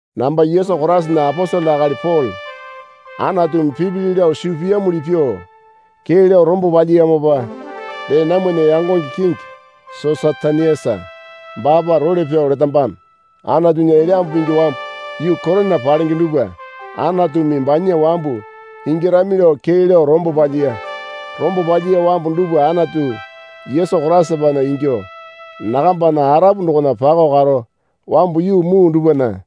Namba Yesu Koraisana aposele akali Pole Anatumi pipili lao suu piyamuli pyuo kee lao rombo palyiyamopa dee namwana yangonge kingi Sosatenisa baapa role pyao letambano. Anatunya Elyambu Pingi wambu yuu Korina palenge dupwa Anatumi banya wambu ingyarami lao kee lao rombo palyiya. Rombo palyiya wambu dupwa Anatu Yesu Koraisapana ingyuo nakambana arapu dokona pakao karo wambu yuu muu dupwana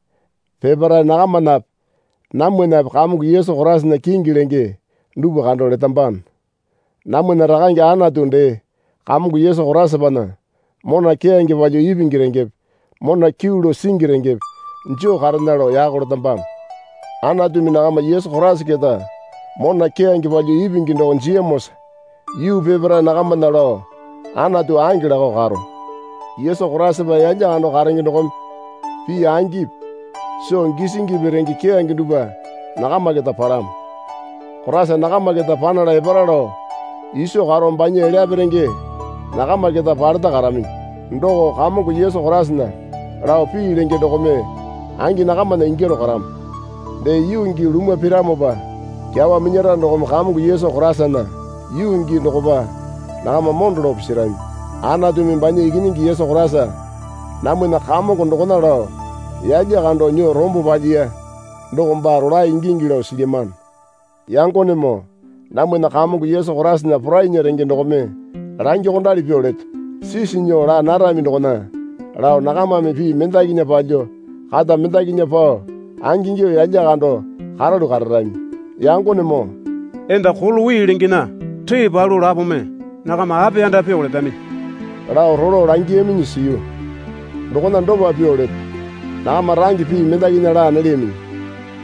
peparae nakamanape namwanape Kamongo Yesu Koraisana kingi lenge dupwa kando letambano. Namwana Rakane Anatu dee Kamongo Yesu Koraisapana mona keyange palyuo ipingi rengepe mona kyuu lao singi rengepe joo karena lao yako letambano. Anatumi nakama Yesu Koraisa keta mona keyange palyuo ipingi doko jiyamosa yuu peparae nakamana lao Anatu ange lakao karo. Yesu Koraisapa yalya kando karenge dokome pii angipi soo gisingipi renge keyange dupwa nakama keta palamo. Koraisa nakama keta panala epara lao iso karo banya elyape renge nakama keta paleta karaminyi. Doko Kamongo Yesu Koraisana lao pii lenge dokome angi nakamana ingyaro karamo. Dee yuu gii lumwa piramopa kyawa minyara dokome Kamongo Yesu Koraisana yuu gii dokopa nakama mondo lao pisirami. Anatumi banya Ikinyingi Yesu Koraisa namwana Kamongo dokona lao yalya kando nyuo rombo palyiya doko baa rolae ingingi lao silyamano. Yangonemoo namwana Kamongo Yesu Koraisana porainya renge dokome langyuokondali pyuo leto. Sisi nyuo laa narami dokona lao nakamame pii mendakinya palyuo kata mendakinya pao angingyuo yalya kando karalu kararami. Yangonemoo, enda Kolowi lengena ree palu lapome nakama apiyanda pyuo letaminyi lao rolo langiyaminyi siyu. Dokona dopa pyuo leto. Nakama range pii mendakinya laa nalyaminyi.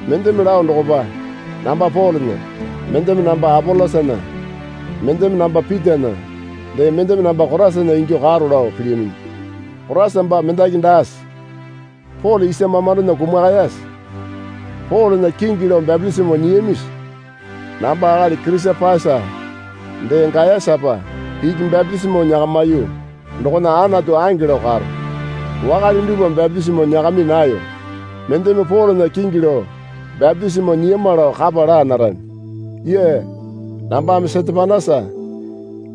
Mendeme lao dokopa namba Polena, mendeme namba Apolosana, mendeme namba Pitana, dee mendeme namba Koraisana ingyuo karo lao pilyaminyi. Koraisa baa mendaki daase? Pole isa mamandona kumakayase? Polena kingi lao bapitisimo nyiyamisi? Namba akali Kirisapasa dee Gayasapa iki bapitisimo nyakamiyu dokona Anatu ange lao karo. Wakale dupwa bapitisimo nyakami nayo. Mendeme Polena kingi lao bapitisimo nyiyama lao kapa laa narami. (Yea, nambame Setepanasa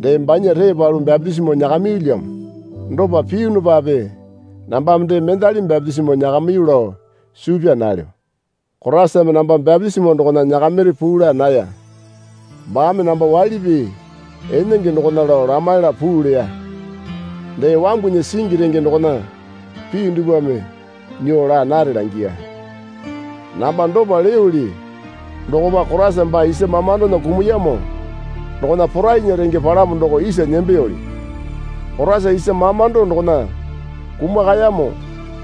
dee banya ree palu bapitisimo nyakamiyulyamo. Dopa piyunupape nambame dee mendali bapitisimo nyakamiyu lao suu pyaa nalyo.) Koraisame namba bapitisimo dokona nyakamiri puu laa naya. Baame namba waili pii enenge dokona lao lamaila puu leya. Dee wambunya singi renge dokona pii dupwame nyuo laa nare langiya. Namba dopa leyoli dokopa Koraisa baa isa mamandona kumuyamo dokona porainya renge palamo doko isa nembeyoli. Koraisa isa mamando dokona kumakayamo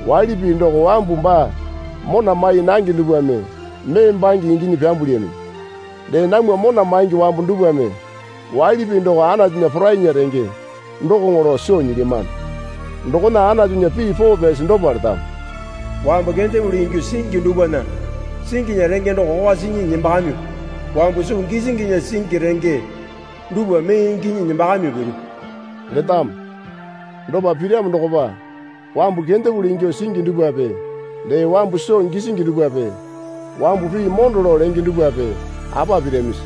waili pii doko wambu baa mona mai nange dupwame mee bange inginyi pyambulyaminyi. Dee namwa mona maingi wambu dupwame waili pii doko Anatunya porainya renge dokoŋo lao soo nyilyamano. Dokona Anatunya pii poo pyasi dopa letamo. Wambu kendepuli ingyuo singi dupwana singinya renge doko kokwa sinyi nembakamyuo wambu soo gisinginya singi renge dupwa mee inginyi nembakamyuo piru, letamo. Dopa piramo dokopa wambu kendepuli ingyuo singi dupwape dee wambu soo gisingi dupwape wambu pii mondo lao lenge dupwape apa piramisi?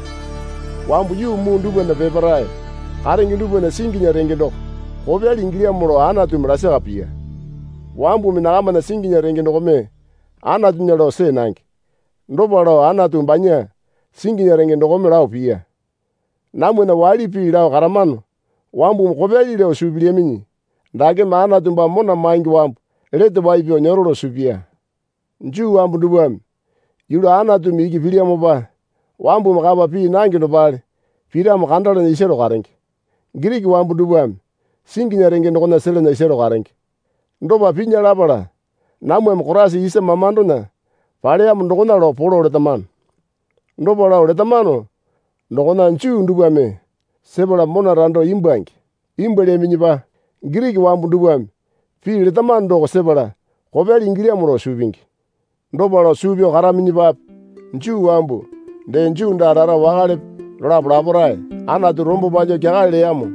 Wambu yuu muu dupwana peparae karenge dupwana singinya renge doko kopyali ingilyamo lao Anatumi lasaka piya. Wambumi nakamana singinya renge dokome Anatunya lao see nange. Dopa lao Anatu banya singinya renge dokome lao piya. Namwana waili pii lao karamano wambumi kopyali lao suu pilyaminyi dakeme Anatu baa mona maingi wambu lete wai pyao nyero lao suu piya. Juu wambu dupwame yulu Anatumi iki pilyamopa wambumi kapa pii nange dopale piramo kandalana isaro karenge. Giriki wambu dupwame singinya renge dokona selana isaro karenge. Dopa pinya lapala namwame Koraisa isa mamandona paleyamo dokona lao polo letamano. Dopa lao letamano dokona Juu dupwame sepala mona rando imbwuange. Imbwualyaminyipa Giriki wambu dupwame pii letamano doko sepala kopyali ingilyamo lao suu pingi. Dopa lao suu pyao karaminyipape Juu wambu dee Juu daa rara wakalepe dolapo laparae Anatu rombo palyuo kyakale leyamo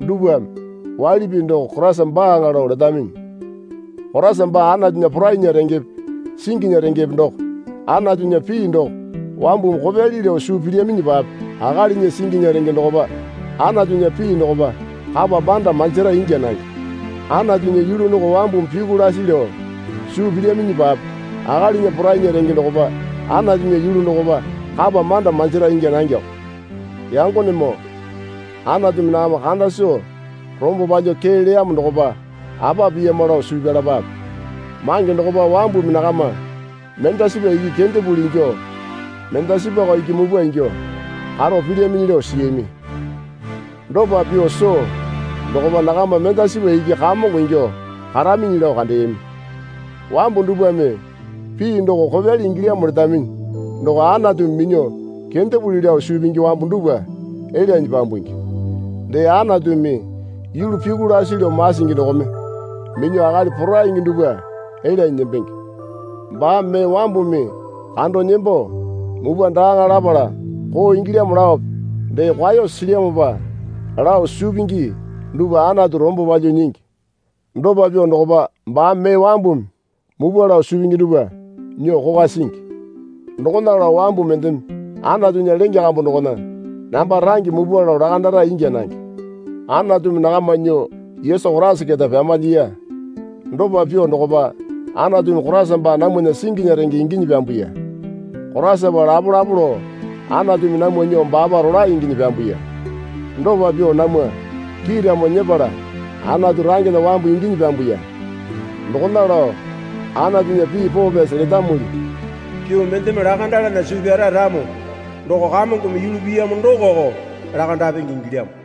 dupwame waili pii doko Koraisa baaŋa lao letaminyi. Koraisa baa Anatunya porainya rengepe singinya rengepe doko. Anatunya pii doko wambumi kopyali lao suu pilyaminyipape akalinya singinya renge dokopa Anatunya pii dokopa kapa manda manjira ingya nange. Anatunya yulu doko wambumi pyuku lasi lao suu pilyaminyipape akalinya porainya renge dokopa Anatunya yulu dokopa kapa manda manjira ingya nangeko. Yangonemoo, Anatumi nakama kanda soo rombo palyuo kee leyamo dokopa apa piyama lao suu pyalapape. Mange dokopa wambumi nakama mendasipa iki kendepuli ingyuo karo dee mendasipako iki mupwa ingyuo karo pilyaminyi lao siyami. Dopa pyuo soo dokopa nakama mendasipa iki kamongo ingyuo karaminyi lao kandeyami. Wambu dupwame pii doko kopyali ingilyamo letaminyi doko Anatumi minyuo kendepuli lao suu pingi wambu dupwa elyanyi pyambungi. Dee Anatumi yulu pyuku lasi lao masingi dokome minyuo akali poraingi dupwa elyanyi nembenge. Baame mee wambumi kando nembo mupwa daaŋa lapala koo ingilyamo laope dee kwao silyamopa lao suu pingi dupwa Anatu rombo palyuo nyingi. Dopa pyuo dokopa baame mee wambumi mupwa lao suu pingi dupwa nyuo kokwa singi. Dokona lao wambu mendeme Anatunya lenge kambu dokona namba range mupwa lao lakandara ingya nange. Anatumi nakama nyuo Yesu Koraisa keta pyamalyiya. Dopa pyuo dokopa Anatumi Koraisa baa namwana singinya renge inginyi pyambuya. Koraisapa lapolapo lao Anatumi namwa nyuo baapa rolae inginyi pyambuya. Dopa pyuo namwa kiiramo nyepala Anatu rangena wambu inginyi pyambuya. Dokona lao Anatunya pii poo pyasi letamuli pyuo mendeme lakandalana suu pyara ramo doko Kamongome yulu piyamo dokoko lakandapenge ingilyamo.